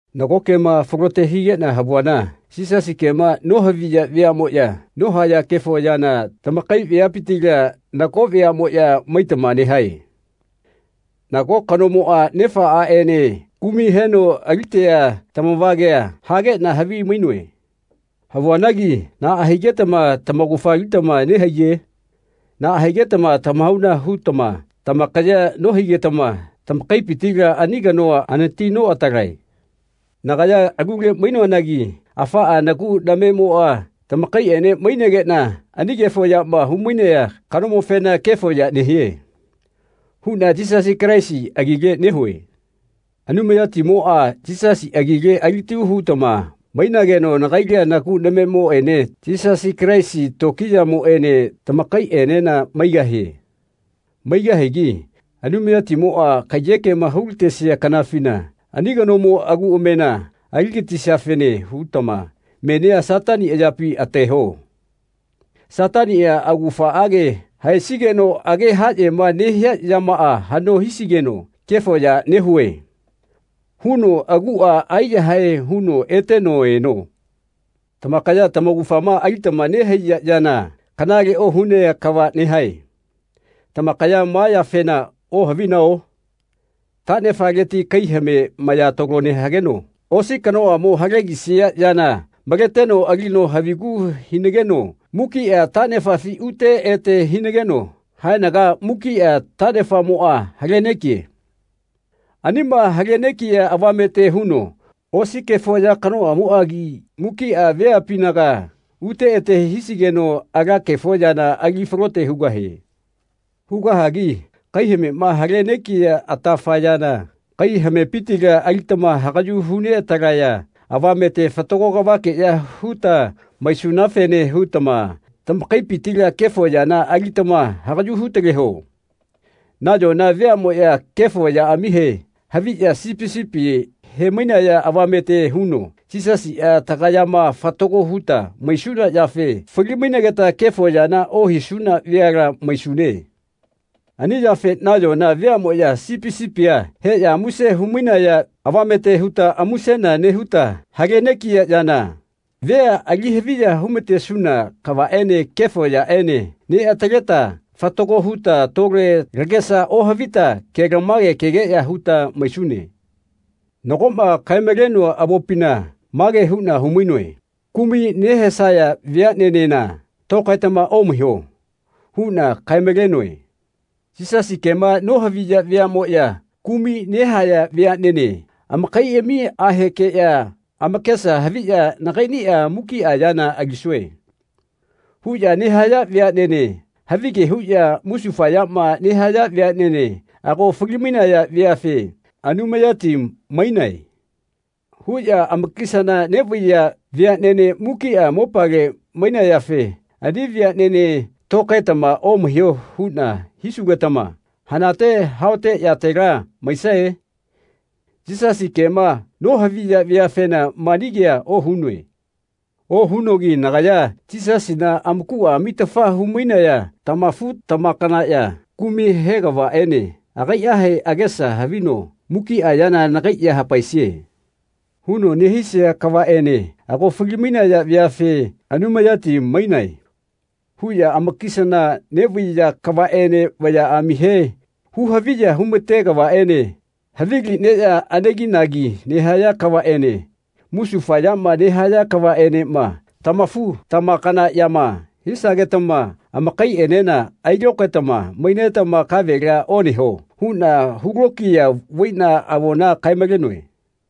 Nago kema falote higeꞌna havuana Yisasi kema nohaviya veaꞌmoꞌya nohaya kefo yana tamakai veapitila nago veaꞌmoꞌya maitama nehae. Nago kanomoꞌa nefa aꞌene kumai heno alitea tamavagea hageꞌna havi-mainoe. Havuanagi naꞌa higetama tamaugafa alitama nehaiye? Naꞌa higetama tamahauna hutama tamakayea nohigetama tamakaipitila ani kanoa anati noꞌatalae. Nagaya alule mainoanagi afaꞌa nagu namemoꞌa tamakaiꞌene mainegeꞌna ani kefo yama humainea kanomofena “Kefo ya nehie.” huꞌna Yisasi Kalaisi agile nehue. Anumayatimoꞌa Yisasi agile alitalu hutama mainageno nagaila nagu namemoꞌene Yisasi Kalaisi tokiyamoꞌene tamakaiꞌena maigahie. Maigahigi Anumayatimoꞌa kaiyekema hulatesia kanafina ani kanomo agu amena aligatisiafene hutama menia Satani ayapi ateho. Sataniꞌa augafaꞌage haesigeno age haꞌyema nehia yamaꞌa haꞌno hisigeno “Kefo ya nehue.” huno aguꞌa aiyahae huno eteno eno. Tamakaya tamaugafama alitama nehaiya yana kanale ohunea kava nehae. Tamakaya ma yafena ohavinao? Taꞌnefaleti kai hame maya talo hageno osi kanoꞌamo halegisia yana maleteno alino havigu hinageno mukiꞌa taꞌnefafi ute ete hinageno haenaga mukiꞌa taꞌnefamoꞌa halenegie. Anima hale negia avamete huno osi kefo ya kanoꞌamoꞌagi mukiꞌa veapinaga ute ete hisigeno ala kefo yana ali falote hugahie. Hugahigi kaihamema hale negia atafa yana kai hamepitila alitama hagaꞌyu hu neꞌatalaya avamete fatago kavakeꞌya huta maisunafene hutama tamakaipitila kefo yana alitama hagaꞌyu hutaleho. Nayona veaꞌmoꞌya kefo yaꞌamihe haviꞌya sipi sipi hemainaya avamete huno Yisasiꞌa tagayama fatago huta maisuna yafe fali-mainegeta kefo yana ohisuna veala maisune. Ani yafe nayona veaꞌmoꞌya sipi sipia heꞌya muse humainaya avamete huta musena nehuta hale negia yana, vea ali haviya humatesuna kavaꞌene kefo yaꞌene neꞌataleta fatago huta tole lagesa ohavita kelamage kegeꞌya huta maisune. Nagoꞌma kae-malenoa avopina mage huꞌna humainoe “Kumai nehesaya veaꞌnenena tokaetama omaiho.” huꞌna kae-malenoe. Yisasi kema nohaviya veaꞌmoꞌya kumai nehaya veaꞌnene amakaiꞌamiꞌahekeꞌya amakesa haviꞌya “Nagaiꞌniꞌa mukiꞌa yana alisue.” huꞌya nehaya veaꞌnene havige huꞌya musufayama nehaya veaꞌnene ago fali-mainaya veafe “Anumayati mainae.” huꞌya amakisana neꞌvaiya veaꞌnene mukiꞌa mopale mainayafe ani veaꞌnene tokaetama omaiho huꞌna hisugetama hanate haote yatela maisae? Yisasi kema nohaviya veafena mani kea ohunoe. Ohunogi nagaya Yisasina amakuꞌa amitafa humainaya tamafu-tamakanaꞌya kumai he kavaꞌene agaiꞌahe agesa havino “Mukiꞌa yana nagai ya hapaesie.” huno nehisia kavaꞌene ago fali-mainaya veafe “Anumayati mainae.” huꞌya amakisana neꞌvaiya kavaꞌene vayaꞌamihe hu-haviya humate kavaꞌene havili neꞌya aneginagi nehaya kavaꞌene musufayama nehaya kavaꞌenema tamafu-tamakanaꞌyama hisagetama amakaiꞌenena ailokaetama maitama kavela oneho huꞌna hulokiya vaiꞌna avona kae-malenoe.